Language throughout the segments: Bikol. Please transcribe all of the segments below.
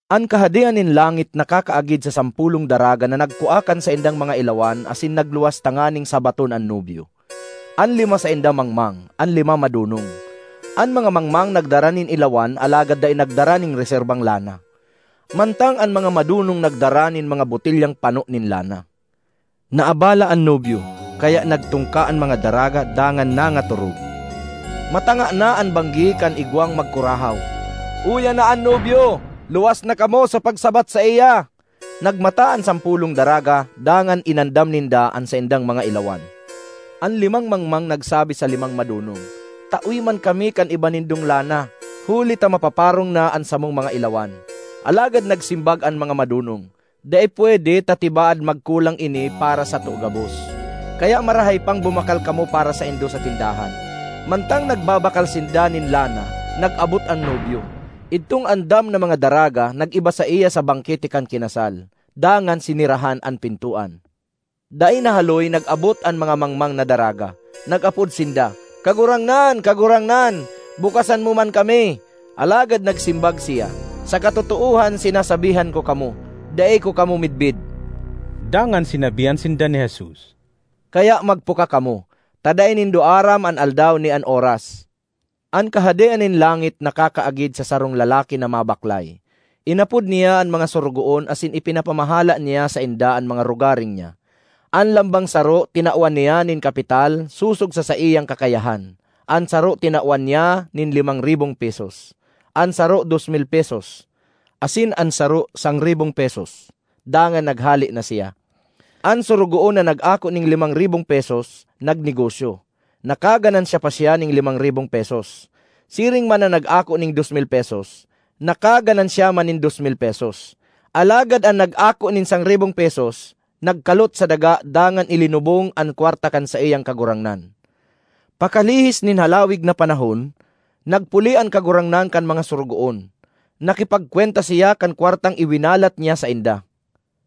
”An Kahadean nin langit nakakaagid sa sampolong daraga na nagkua kan saindang mga ilawan asin nagluwas tanganing sabaton an nobyo. An lima sainda mangmang, an lima madonong. An mga mangmang nagdara nin ilawan alagad dai nagdara nin reserbang lana, mantang an mga madonong nagdara nin mga botelyang pano nin lana. Naabala an nobyo, kaya nagtungka an mga daraga dangan nangatorog. ”Matanga na an banggi kan igwang magkurahaw, ‘Uya na an nobyo! Luwas na kamo sa pagsabat saiya!’ Nagmata an sampolong daraga dangan inandam ninda an saindang mga ilawan. An limang mangmang nagsabi sa limang madonong, ‘Tawe man kami kan iba nindong lana huli ta mapaparong na an samong mga ilawan.’ Alagad nagsimbag an mga madonong, ‘Dai pwede ta tibaad magkulang ini para sato gabos; kaya marahay pang bumakal kamo para saindo sa tindahan.’ Mantang nagbabakal sinda nin lana, nag-abot an nobyo. Idtong andam na mga daraga nag-iba saiya sa bangkete kan kinasal, dangan sinerahan an pintoan. ”Dai nahaloy nag-abot an mga mangmang na daraga. Nag-apod sinda. ‘Kagurangnan, Kagurangnan! Bukasan mo man kami!’ Alagad nagsimbag siya, ‘Sa katotoohan sinasabihan ko kamo, dai ko kamo midbid!’” Dangan sinabihan sinda ni Jesus, “Kaya magpuka kamo, ta dai nindo aram an aldaw ni an oras. ”An Kahadean nin langit nakakaagid sa sarong lalaki na mabaklay. Inapod niya an mga sorogoon asin ipinapamahala niya sainda an mga rogaring niya. An lambang saro tinawan niya nin kapital sosog sa saiyang kakayahan: an saro tinawan niya nin limang ribong pesos, an saro dos mil pesos, asin an saro sangribong pesos. Dangan naghale na siya. An sorogoon na nag-ako nin limang ribong pesos nagnegosyo; nakaganansya pa siya nin limang ribong pesos. Siring man an nag-ako nin dos mil pesos; nakaganansya man nin dos mil pesos. Alagad an nag-ako nin sangribong pesos, nagkalot sa daga dangan ilinubong an kwarta kan saiyang kagurangnan. ”Pakalihis nin halawig na panahon, nagpuli an kagurangnan kan mga sorogoon. Nakipagkwenta siya kan kwartang iwinalat niya sainda.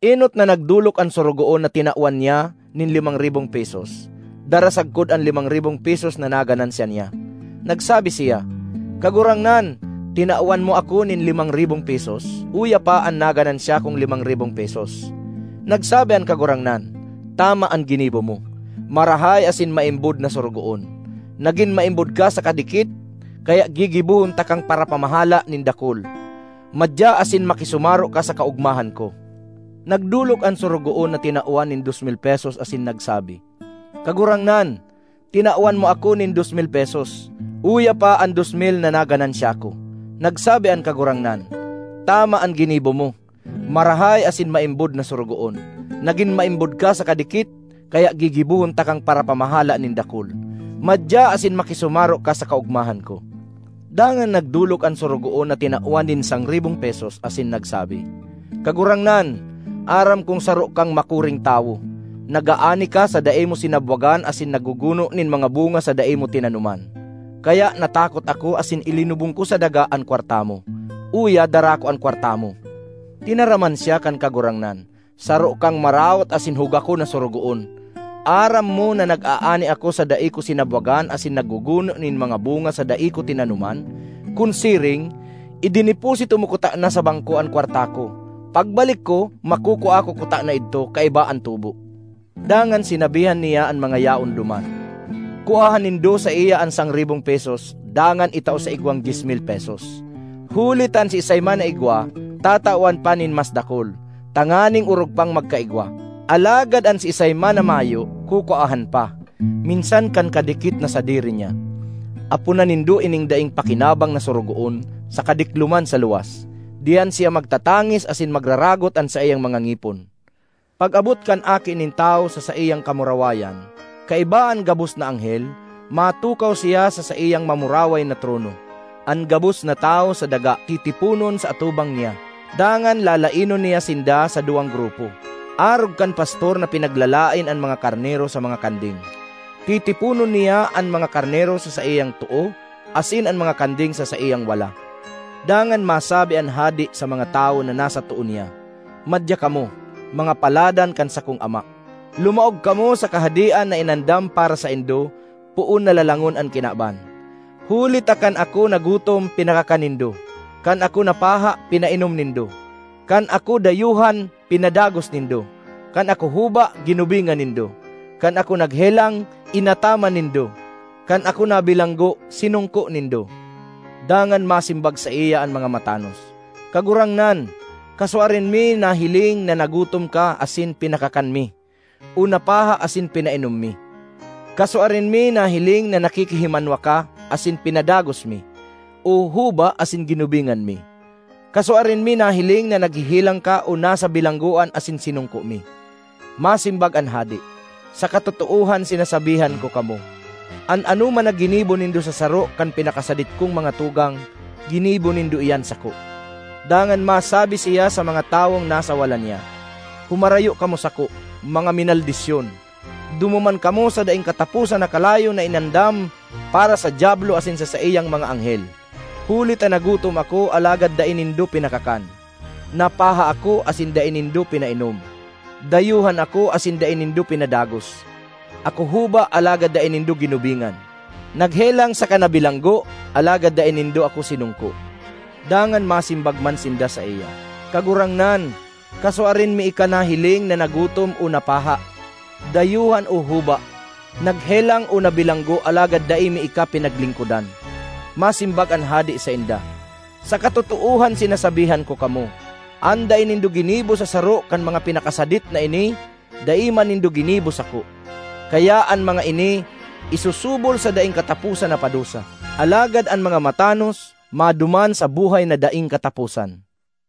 Enot na nagdolok an sorogoon na tinawan niya nin limang ribong pesos, dara sagkod an limang ribong pesos na naganansya niya. Nagsabi siya, ‘Kagurangnan, tinawan mo ako nin limang ribong pesos; uya pa an naganansya kong limang ribong pesos.’ Nagsabi an kagurangnan, ‘Tama an ginibo mo, marahay asin maimbod na sorogoon! Nagin maimbod ka sa kadikit, kaya gigibohon takang parapamahala nin dakul. Madya asin makisumaro ka sa kaogmahan ko!’ Nagdolok an sorogoon na tinawan nin dos mil pesos asin nagsabi, ‘Kagurangnan, tinawan mo ako nin dos mil pesos; uya pa an dos mil na naganansya ko!’ Nagsabi an kagurangnan, ‘Tama an ginibo mo, marahay asin maimbod na sorogoon! Nagin maimbod ka sa kadikit, kaya gigibohon takang parapamahala nin dakul. Madya asin makisumaro ka sa kaogmahan ko!’ Dangan nagdolok an sorogoon na tinawan nin sangribong pesos asin nagsabi, ‘Kagurangnan, aram kong saro kang makuring tawo; nag-aani ka sa dai mo sinabwagan asin nagguguno nin mga bunga sa dai mo tinanoman. Kaya natakot ako asin ilinubong ko sa daga an kwarta mo. Uya, dara ko an kwarta mo.’ Tinaraman siya kan kagurangnan, ‘Saro kang maraot asin hugakon na sorogoon! Aram mo na nag-aani ako sa dai ko sinabwagan asin nagguguno nin mga bunga sa dai ko tinanoman. Kun siring, idineposito mo kutana sa bangko an kwarta ko. Pagbalik ko makukua ko kutana idto kaiba an tubo.’ Dangan sinabihan niya an mga yaon duman, ‘Kuaha nindo saiya an sangribong pesos dangan itao sa igwang dyes mil pesos. Huli ta an siisay man na igwa, tatawan pa nin mas dakul, tanganing orog pang magkaigwa; alagad an siisay man na mayo, kukuahan pa, minsan kan kadikit na sadiri niya. Aponan nindo ining daing pakinabang na sorogoon sa kadikloman sa luwas; diyan siya magtatangis asin magraragot an saiyang mga ngipon.’ ”Pag-abot kan Aki nin Tawo sa saiyang kamurawayan, kaiba an gabos na anghel, matukaw siya sa saiyang mamuraway na trono. An gabos na tawo sa daga titiponon sa atubang niya. Dangan lalaenon niya sinda sa duwang grupo, arog kan pastor na pinaglalaen an mga karnero sa mga kanding. Titiponon niya an mga karnero sa saiyang too asin an mga kanding sa saiyang wala. Dangan masabi an Hade sa mga tawo na nasa too niya, ‘Madya kamo, mga paladan kan sakong Ama! Lumaog kamo sa Kahadean na inandam para saindo poon na lalangon an kinaban. Huli ta kan ako nagutom pinakakan nindo; kan ako napaha pinainom nindo; kan ako dayuhan pinadagos nindo; kan ako huba ginubingan nindo; kan ako naghelang inataman nindo; kan ako nabilanggo sinongko nindo.’ Dangan masimbag saiya an mga matanos, ‘Kagurangnan, kasuarin mi nahiling na nagutom ka asin pinakakan mi o napaha asin pinainom mi? Kasuarin mi nahiling na nakikihimanwa ka asin pinadagos mi, o huba asin ginubingan mi? Kasuarin mi nahiling na naghehelang ka o nasa bilanggoan asin sinongko mi?’ Masimbag an Hade, ‘Sa katotoohan sinasabihan ko kamo, an anoman na ginibo nindo sa saro kan pinakasadit kong mga tugang, ginibo nindo iyan sako!’ ”Dangan masabi siya sa mga tawong nasa wala niya, ‘Humarayo kamo sako, mga minaldisyon! Dumuman kamo sa daing kataposan na kalayo na inandam para sa Diablo asin sa saiyang mga anghel! Huli ta nagutom ako alagad dai nindo pinakakan; napaha ako asin dai nindo pinainom. Dayuhan ako asin dai nindo pinadagos; ako huba alagad dai nindo ginubingan; naghelang saka nabilanggo alagad dai nindo ako sinongko.’ Dangan masimbag man sinda saiya, ‘Kagurangnan, kasuarin mi ika nahiling na nagutom o napaha, dayuhan o huba, naghelang o nabilanggo alagad dai mi ika pinaglingkodan?’ Masimbag an Hade sainda, ‘Sa katotoohan sinasabihan ko kamo, an dai nindo ginibo sa saro kan mga pinakasadit na ini, dai man nindo ginibo sako.’ Kaya an mga ini isusubol sa daing kataposan na padusa, alagad an mga matanos maduman sa buhay na daing kataposan.”